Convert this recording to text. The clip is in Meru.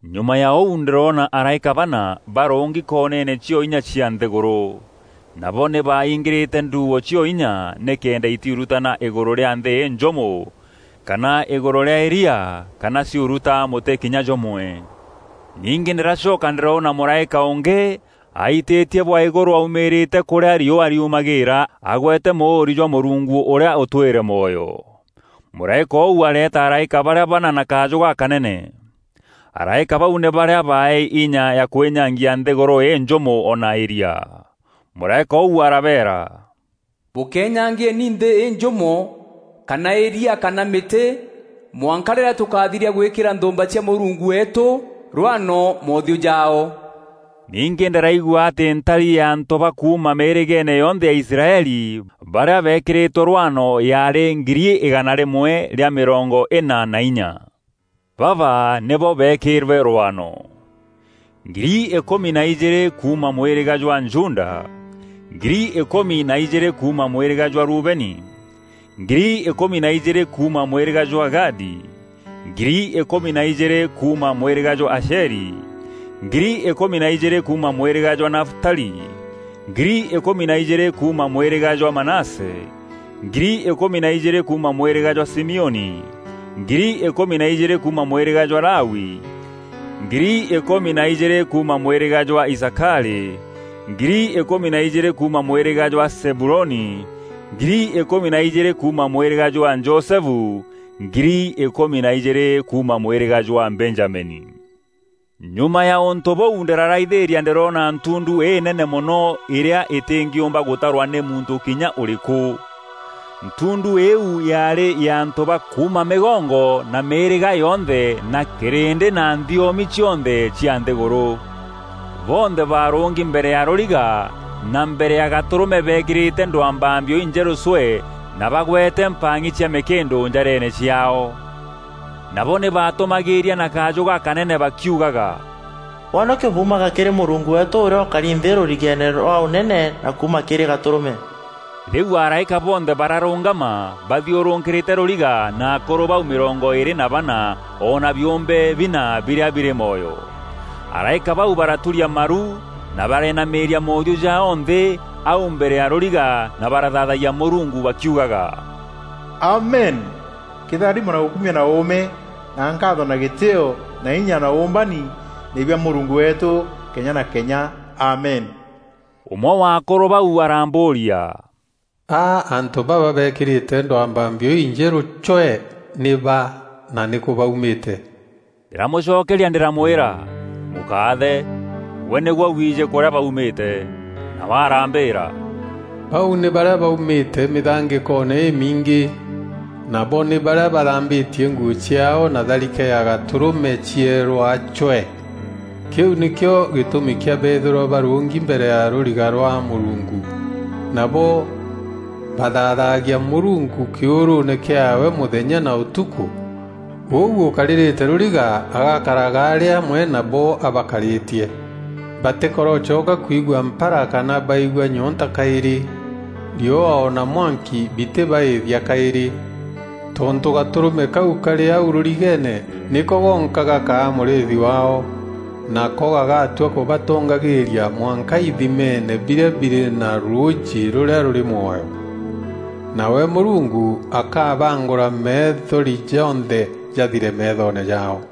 Nyuma ya ûu ndîroona araîka bana barûngi koneene cio inya cia nthîgûrû. Nabo nî baaingîrîte ndûûo cio inya nîkenda îtiurutana îgûrû rîa nthî înjûmo kana îgûrû rîa îria kana ciuruta mûtî kinya jûmwe. Ningî ndîracoka ndîroona mûraîka ûngî aitîtie bwa îgûrû aumîîrîte kûrîa riûa riumagîîra agwete mûûri jwa Mûrungu ûrîa ûtwîre mwoyo. Mûraîka ûu areeta araîka barîa bana na kajû gakanene. Araîka bau nî barîa baaeei inya ya kwînyangia nthîgûrû înjûmo o na îria. Mûraîka ûu arabeera, “Bûkenyangieni nthî înjûmo kana îria kana mîtî mwanka rîrîa tûkathiria gwîkîra nthûûmba cia Mûrungu weetû rwano moothiû jaao.” Ningî ndîraigua atî ntari ya antû ba kuuma mîîrîgeene yonthe ya Israeli barîa beekîrîtwe rwano yaarî ngiri îgana rîmwe rîa mîrongo îna na inya. Baba nîbo beekîrwe rwano: Ngiri îkûmi na ijîîrî kuuma mwîrîga jwa Juda, ngiri îkûmi na ijîîrî kuuma mwîrîga jwa Rubeni, ngiri îkûmi na ijîîrî kuuma mwîrîga jwa Gadi, ngiri îkûmi na ijîîrî kuuma mwîrîga jwa Asheri, ngiri îkûmi na ijîîrî kuuma mwîrîga jwa Nafutali, ngiri îkûmi na ijîîrî kuuma mwîrîga jwa Manase, ngiri îkûmi na ijîîrî kuuma mwîrîga jwa Simioni, ngiri îkûmi na ijîîrî kuuma mwîrîga jwa Lawi, ngiri îkûmi na ijîîrî kuuma mwîrîga jwa Isakari, ngiri îkûmi na ijîîrî kuuma mwîrîga jwa Zebuloni, ngiri îkûmi na ijîîri kuuma mwîrîga jwa Josefu, ngiri îkûmi na ijîîrî kuuma mwîrîga jwa Benjamini. Nyuma ya ûntû bûu ndîraraithîîria ndîroona ntundu înene mono îrîa îtîngîûmba gûtarwa nî muntû kinya ûrîkû! Ntundu îîu yaarî ya antû ba kuuma mîgongo na mîîrîga yonthe na kîrîndî na nthiomi cionthe cia nthîgûrû. Bonthe baarûngi mbere ya rûriga na mbere ya Gatûrûme beekîrîte ndwambambio injerû cwee na bagwete mpang'i cia mîkîndû njareene ciaao. Nabo nî baatûmagîîria na kajû gakanene bakiugaga, “Wonokio buumaga kîrî Mûrungu weetû ûrîa ûkari nthî rûrigeene rwa ûnene na kuuma kîrî Gatûrûme!” Rîu araîka bonthe bararûngama bathiûrûkîrîte rûriga na akûrû bau mîrongo îîrî na bana o na biûmbe bina birîa birî mwoyo. Araîka bau baraturia maru na barenamîîria moothiû jaao nthî au mbere ya rûriga na barathaathayia Mûrungu bakiugaga, “Amen! Kîtharimo na ûkumio na uume, na nkaatho na gîtîîo na inya na ûûmbani nî bia Mûrungu weetû kenya na kenya Amen!” Ûmwe wa akûrû bau arambûûria, “A antû baba beekîrîte ndwambambio injerû cwee nî ba na nîkû baumîte?” Ndîramûcokeria ndîramwîra, “Mûkaathe, gwe nîgwe wiijî kûrîa baumîte.” Nawe arambîîra, “Bau nî barîa baumîte mîthangîkoone îmiingî. Nabo nî barîa bathambîtie nguû ciaao na tharike ya Gatûrûme cierûa cwee. Kîu nîkîo gîtûmi kîa beethîrwa barûngi mbere ya rûriga rwa Mûrungu, nabo bathaathagia Mûrungu kîûrûûne kîaawe mûthenya na ûtukû, ûu ûkarîrîte rûriga agakaraga arî amwe nabo abakarîtie. Batîkarocoka kwigua mpara kana baigua nyoonta kaîrî; riûa o na mwanki bitîbaîthia kaîrî. Tontû Gatûrûme kau kaarî au rûrigeene, nîko gonka gakaa mûrîîthi waao, nako gagatua kûbatongagîîria mwanka ithimeene birîa birî na rûûjî rûrîa rûrî mwoyo. Nawe Mûrungu akabaangûra methori jonthe jathire meethoone jaao.”